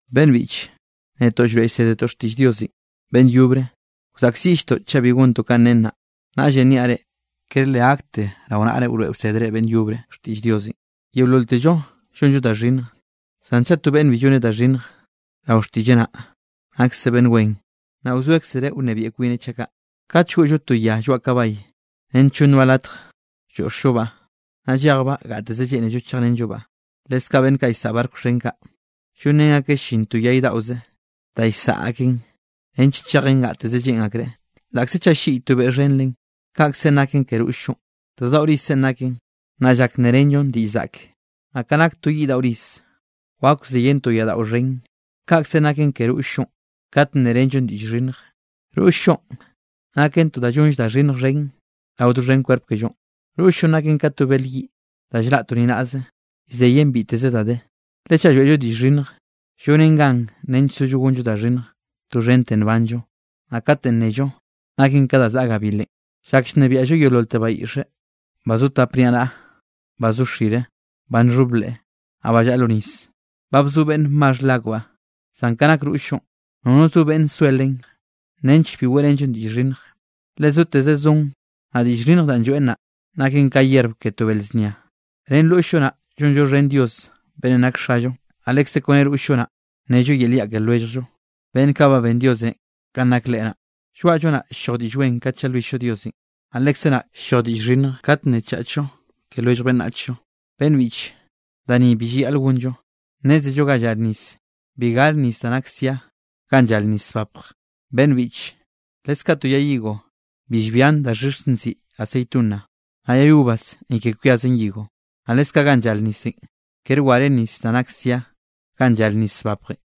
Beꞌnn biꞌche, netoꞌ llroeꞌ llsédetoꞌ xtiꞌll Diosenꞌ beꞌnn yobre, wzaꞌkziꞌlltoꞌ chaꞌ bi gontoꞌ kanꞌ nen naꞌ. Naꞌllenꞌ niaꞌ reꞌ, kere le gakte rao naꞌre wroeꞌ wsédere beꞌnn yobre xtiꞌll Diosenꞌ. Yeololtello llonllo da xhinnj, zan chaꞌ to beꞌnne bi lloneꞌ da xhinnj rao xtiꞌlleꞌ naꞌ, nakseꞌ beꞌnn wen, naꞌ wzoekzereꞌ nnebiaꞌ kwineꞌ chaꞌ kaꞌ. Kate llgoꞌllo to ya lloaꞌ kabay nench llonnbaꞌ latj lloꞌxllobaꞌ, naꞌ llejbaꞌ gateze lleꞌnello chejrenllobaꞌ. Leskaꞌ beꞌnn kaꞌ llsaꞌa barco xhen kaꞌ, llonrén akeꞌ llin to yay daꞌoze da llsaꞌa akeꞌn nench chejen gateze lleꞌn akreꞌ, laꞌkze chaꞌ ll-lliꞌy to beꞌ xhen len. Kaꞌkzenꞌ naken ke roll-llonꞌ. To da daꞌo rizzenꞌ naken, naꞌ llak nnerenllon diꞌll zaꞌke. Naꞌ ka nak to yiꞌ daꞌo riz, wak wzeyen to yaꞌdaꞌo xhen, kaꞌkzenꞌ naken ke roll-llonꞌ kate nnerenllon diꞌll xhinnj. Roll-llonꞌ naken to da llonll da xhinnj xhen rao doxhen kwerp kellonꞌ. Roll-llonꞌ naken ka to bel yiꞌ da llraꞌ to ni naꞌze, llzeyen biteze da de, le chaꞌ lloeꞌllo diꞌll xhinnj, llonen gan nench sollo gonllo da xhinnj doxhente nbanllo. Naꞌ katenꞌ nnello, naken ka da zaꞌa gabilenꞌ. Llak llnebiaꞌllo yeololte bayiꞌxe, ba zo tap niaꞌnaꞌa, ba zo xire, ba nxhob leꞌe, naꞌ ba llaꞌa lo nis. Ba bzo beꞌnn maxh leakbaꞌ. Zan ka nak roll-llonꞌ nono zo beꞌnn soe len, nench bi weꞌrenllo diꞌll xhinnj. Le zoteze zon lloeꞌn diꞌll xhinnj, naꞌ diꞌll xhinnj danꞌ lloeꞌn, naꞌ naken ka yerb ke to bel znia. Ren roll-llo naꞌ llonllo xhen Dios beꞌnnenꞌ nak Xallo. Naꞌ lekze kone roll-llo naꞌ, nello yel yaꞌ ke lwelljllo, beꞌnn kaꞌ ben Diosenꞌ kanꞌ nak Leꞌe naꞌ. Lloaꞌllo naꞌ ll-lloj diꞌll wen kat llalwill-llo Diosenꞌ, naꞌ lekze naꞌ ll-lloj diꞌll xhinnj kat nnechachllo ke lwellj beꞌnnachllo. Beꞌnn biꞌche, da ni bi llayaꞌl gonllo. Nnézello ga llar nisenꞌ, bi gare nis da nak sia ganꞌ llar nis zbapj. Beꞌnn biꞌche, leskaꞌ to yay higo bi llbian daxhix nziꞌi aceituna, naꞌ yay uvas ni ke kwiazen higo. Naꞌ leskaꞌ ganꞌ llar nisenꞌ, kere ware nis da nak sia ga llare nis zbapjenꞌ.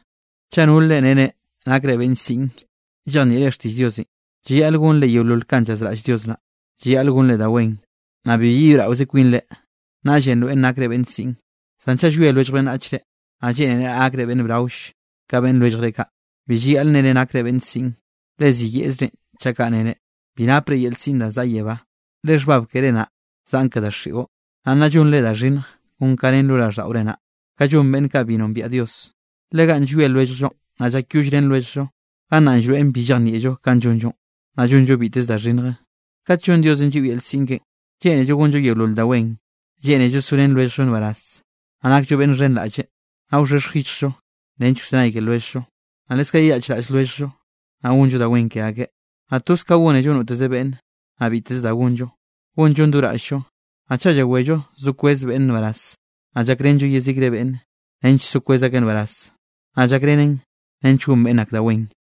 Chaꞌ nol reꞌ nnere nakre beꞌnn siꞌn llejnieꞌre xtiꞌll Diosenꞌ, llayaꞌl gonre yeolol kanꞌ llazraꞌll Dios naꞌ. Llayaꞌl gonre da wen, naꞌ bi yeyoeꞌraoze kwinre, naꞌllenꞌ nroeꞌn nakre beꞌnn siꞌn. Zan chaꞌ llwie lwellj beꞌnnachre, naꞌ lleꞌnere gakre beꞌnn braoll ka beꞌnn lwelljre kaꞌ, bi llayaꞌl nnere nakre beꞌnn siꞌn, le ziyeꞌzren chaꞌ kaꞌ nere. Bi napre yel siꞌn da zaꞌa yebá, le xhbab keré naꞌ zaꞌn ke daxiꞌon, naꞌ nna llonre da xhinnj kon kanꞌ ne raꞌlldaꞌore naꞌ, kanꞌ llon beꞌnn kaꞌ bi nombiaꞌ Dios. Le ganꞌ llwie lwelljllo, naꞌ llakyollrén lwelljllo, gannaꞌ llroeꞌn bi llejnieꞌllo kanꞌ llonllo, naꞌ llonllo biteze da xhinnje. Kat llonn Diosenꞌ lliꞌo yel siꞌn keꞌen, lleꞌnello gonllo yeolol da wen. Lleꞌnello sorén lwelljllo nbaraz, naꞌ nakllo beꞌnn xhenraꞌlle, naꞌ wxhexj yichjllo nench wzenay ke lwelljllo. Naꞌ leskaꞌ yeyaꞌchraꞌll lwelljllo, naꞌ gonllo da wen ke akeꞌ, naꞌ toz ka gónello noteze beꞌnne. Naꞌ biteze da gonllo, gonllon do raꞌll-llo. Naꞌ chaꞌ llawello so kwez beꞌnne nbaraz, naꞌ llakrenllo yezikre beꞌnne, nench so kwez akeꞌ nbaraz, naꞌ llakrenen nench gon beꞌnn ak da wen.